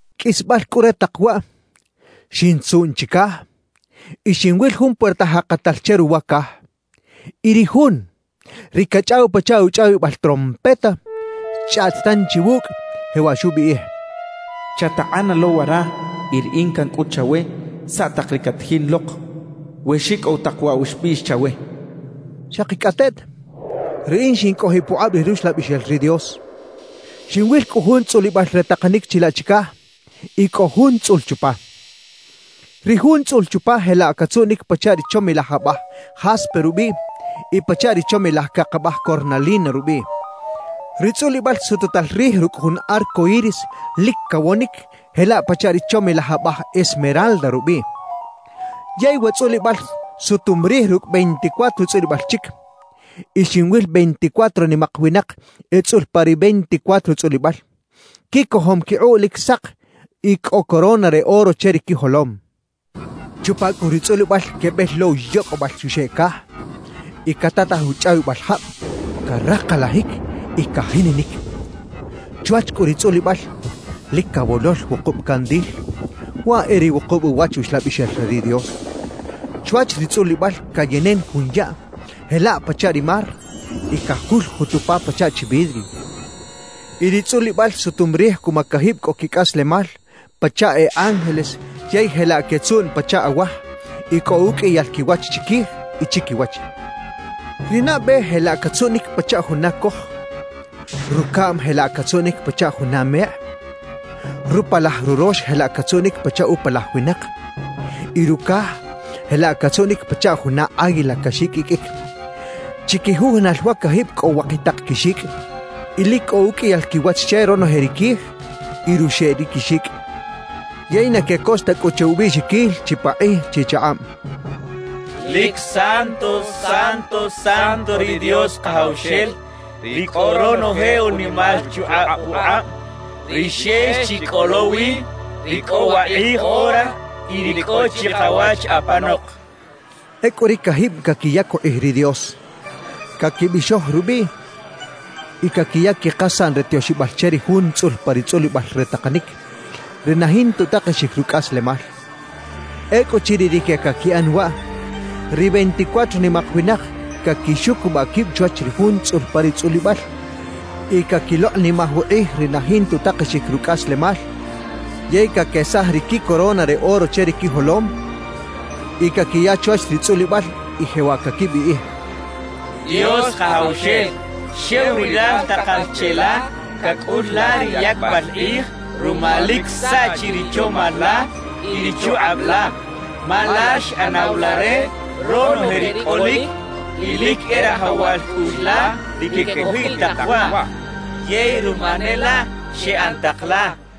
Qꞌuisbal cꞌu re tak waꞌ, xintzuꞌn chicaj y xinwil jun puerta jakatal che ruwa caj. Y ri Jun, ri cachꞌaw pachaꞌ uchꞌawibal trompeta, xchꞌaꞌt tanchi wucꞌ, jewaꞌ xubiꞌij: «Chatakꞌana lo wara y Riꞌin cancꞌut chawe saꞌ tak ri catajin lok we xicꞌow tak waꞌ wa xbiꞌx chawe» xchaꞌ. Xakicꞌateꞌt, riꞌin xincꞌojiꞌ pukꞌab ri Ruxlabixel ri Dios. Xinwil cꞌu jun tzꞌulibal re takanic chilaꞌ chicaj y cꞌo Jun tzꞌul chupa. Ri Jun tzꞌul chupa jelaꞌ catzuꞌnic pachaꞌ ri chomilaj abaj jaspe rubiꞌ y pachaꞌ ri chomilaj cak abaj cornalina rubiꞌ. Ri tzꞌulibal sututal rij rucꞌ jun arco iris lic cawonic jelaꞌ pachaꞌ ri chomilaj abaj esmeralda rubiꞌ. Yey wa tzꞌulibal sutum rij rucꞌ veinticuatro tzꞌulibal chic. Y xinwil veinticuatro nimak winak etzꞌul pa ri veinticuatro tzꞌulibal, quicojom quikꞌuꞌ lic sak y cꞌo corona re oro che ri quijolom. Chupa cꞌu ri tzꞌulibal quebel lo uyocꞌbal uxeꞌ caj y catataj uchꞌawibal jab caraklajic y cajininic. Chwach cꞌu ri tzꞌulibal, lic cawolol wukub candil, waꞌ e ri wukub uwach Uxlabixel re ri Dios. Chwach ri tzꞌulibal cayenen jun yaꞌ jelaꞌ pachaꞌ ri mar y cajuljut upa pachaꞌ chi vidrio. Y ri tzꞌulibal sutum rij cuma cajib cꞌo quicꞌaslemal pachaꞌ e ángeles yey jelaꞌ quetzuꞌn pachaꞌ awaj y cꞌo uqꞌuiyal quiwach chiquij y chiquiwach. Ri nabe jelaꞌ catzuꞌnic pachaꞌ juna coj, rucaꞌm jelaꞌ catzuꞌnic pachaꞌ juna mekꞌ, rupalaj rurox jelaꞌ catzuꞌnic pachaꞌ upalaj winak y rucaj jelaꞌ catzuꞌnic pachaꞌ juna águila caxiqꞌuiqꞌuic. Chiquijujunal wa cajib cꞌo wakitak quixicꞌ. Y lic cꞌo uqꞌuiyal quiwach che ronoje ri quij y ruxeꞌ ri quixicꞌ. Yey na quecos ta cꞌu che ubiꞌxiquil chipakꞌij chichakꞌab: «¡Lic Santo, Santo, Santo ri Dios Kajawxel, ri cꞌo ronoje unimal chukꞌab pukꞌab, ri xex chi cꞌo lo wi, ri cꞌo wakꞌij ora y ri cꞌo chikawach apanok!» quechaꞌ. Ecꞌu ri cajib caquiyac ukꞌij ri Dios, caquibixoj rubiꞌ y caquiya quikasaꞌn re tioxibal che ri Jun tzꞌul pa ri tzꞌulibal re takanic, ri na jinta utakexic rucꞌaslemal. Ecꞌuchiriꞌ rique caquiꞌan waꞌ, ri veinticuatro nimak winak caquixucubaꞌ quib chwach ri Jun tzꞌul pa ri tzꞌulibal y caquilokꞌnimaj ukꞌij ri na jinta utakexic rucꞌaslemal yey caquesaj ri quicorona re oro che ri quijolom y caquiya chwach ri tzꞌulibal y jewaꞌ caquibiꞌij: «Dios Kajawxel, xew Rilal takal cheꞌla cacꞌul la ri yacbal kꞌij ruma lic saꞌchi ri chomal la y ri chukꞌab la; ma Lal xꞌanaw la re ronoje ri cꞌolic y lic e rajawal cꞌuꞌx la ri quecꞌojiꞌ tak waꞌ yey ruma ne laꞌ xeꞌan tak la» quechaꞌ.